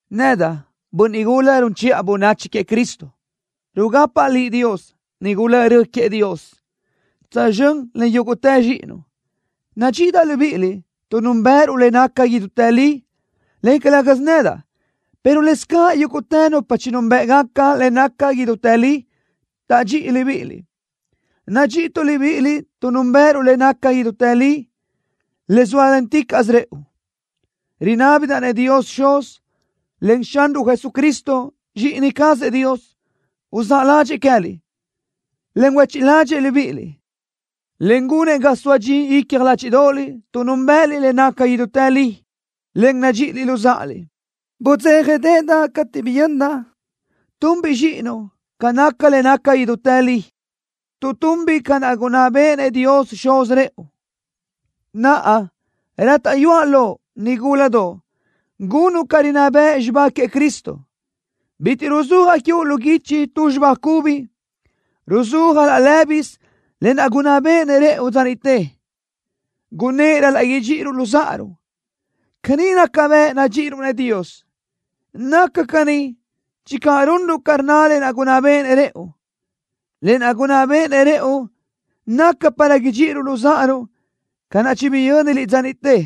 Nedaʼ, bönniʼ gula run chiʼa bönachi queëʼ Cristo, rugapaʼ liʼ Dios, nigula rö queëʼ Dios, tsözxö́n len yúguʼtë zxíʼinuʼ. Nadxíʼidaʼ libíʼiliʼ tuʼ núnbëʼëruʼ le naca idútë li, en calë́gasö nedaʼ, pero lëscaʼ yúguʼtë nupa chinúnbëʼgaca le naca idútë li taʼdxíʼi libíʼiliʼ. Nadxíʼituʼ libíʼiliʼ tuʼ núnbëʼëruʼ le naca idútë li, le zóalenticaʼsö rëʼu. Rinábidaʼ-nëʼ Dios Xuz, en Xanruʼ Jesucristo, Zxíʼini cazëʼ Dios, uzáʼ ládxëʼë queë́liʼ, en huéchiʼ ládxëʼë libíʼiliʼ, en gunëʼ ga soa dxi icja ládxiʼdoʼoliʼ tuʼ núnbëʼëliʼ le naca idútë li, en nadxíʼiliʼ luzáʼaliʼ. Budzéjadeʼedaʼ cateʼ biyöndaʼ tunbiʼ zxíʼinuʼ ca naca le naca idútë li, tuʼ tunbiʼ ca naʼ gunná béʼenëʼ Dios Xuz rëʼu. Naʼa, rátaʼyuaʼ loʼ, nigúladoʼ, gunuʼ ca rinná bëʼ xibá queëʼ Cristo. Bitiʼ ruzúajaʼ quiuʼ lu guichi tu xibá cubi. Ruzúajaʼ laʼ lë́bisö lë naʼ gunná béʼenëʼ rëʼu dza niʼte. Gunnë́ʼ ral-laʼ idxíʼiruʼ luzáʼaruʼ. Caní naca bëʼ nadxíʼiruʼ-nëʼ Dios. Naca caní channö runruʼ ca rnna le gunná béʼenëʼ rëʼu. Lë naʼ gunná béʼenëʼ rëʼu naca para idxíʼiruʼ luzáʼaruʼ ca naʼ chibiyö́niliʼ dza niʼte.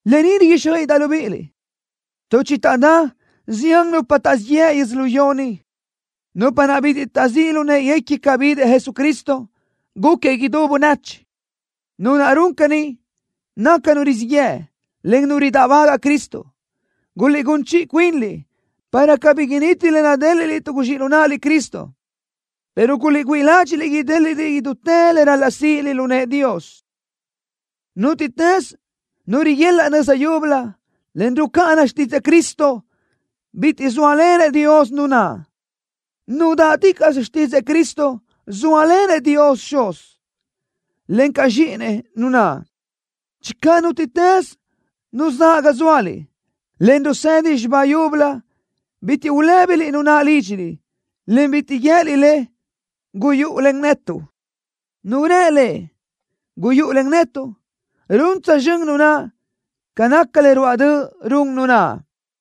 Lë ni riguíxjöiʼidaʼ libíʼiliʼ, tuʼ chitaʼdá zián nupa taʼzíʼ yëʼ yödzölió ni, nupa naʼ bitiʼ taʼzíʼ lu në́ʼeguequi ca bidëʼ Jesucristo, gúquiëʼ idú bönachi. Nu naʼ run caní, naca nu rizíʼ yëʼ, en nu ridáʼbagaʼ Cristo. Guliʼgún chiʼi cuinliʼ para cabí initi le nadéliʼliʼ tuʼ guzxíʼ lu naʼliʼ Cristo, pero guliʼgüíʼ ládxiʼliʼ idéliʼliʼ idútë le ral-laʼ síʼiliʼ lu nëʼë Dios. Nútiʼtës nu riguelaʼ nöza yúbölö, en rucáʼana xtídzëʼë Cristo, bitiʼ zóalenëʼ Dios nu naʼ. Nu dáʼticaʼsö xtídzëʼë Cristo, zóalenëʼ Dios Xuz, encaʼ Zxíʼinëʼ nu naʼ. Channö nútiʼtës nu zaʼ ga zóaliʼ, en rusedi xibá yúbölö, bitiʼ ulë́biliʼ nu naʼ lídxiliʼ, en bitiʼ guië́liʼ le: “Guyúʼu len netuʼ.” Nu rë le: “Guyúʼu len netuʼ”, run tsözxö́n nu naʼ ca naca le ruáʼ döʼ run nu naʼ.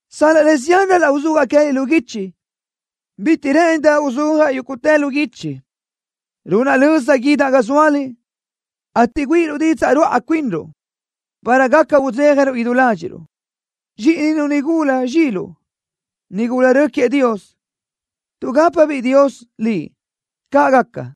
Sal-laʼ le zián ral-laʼ uzúajaʼ queë́liʼ lu guichi, bitiʼ rë́ʼëndaʼ uzúajaʼ yúguʼtë lu guichi. Runaʼ löza guídaʼ ga zóaliʼ, ateʼ güíʼiruʼ didzaʼ ruáʼa cuinruʼ, para gaca udzéjaruʼ idú ládxiʼruʼ. Zxíʼininu nigula zxiluʼ, nigula rö queëʼ Dios, tuʼgápabiʼ Dios liʼ. ¡Caʼ gaca!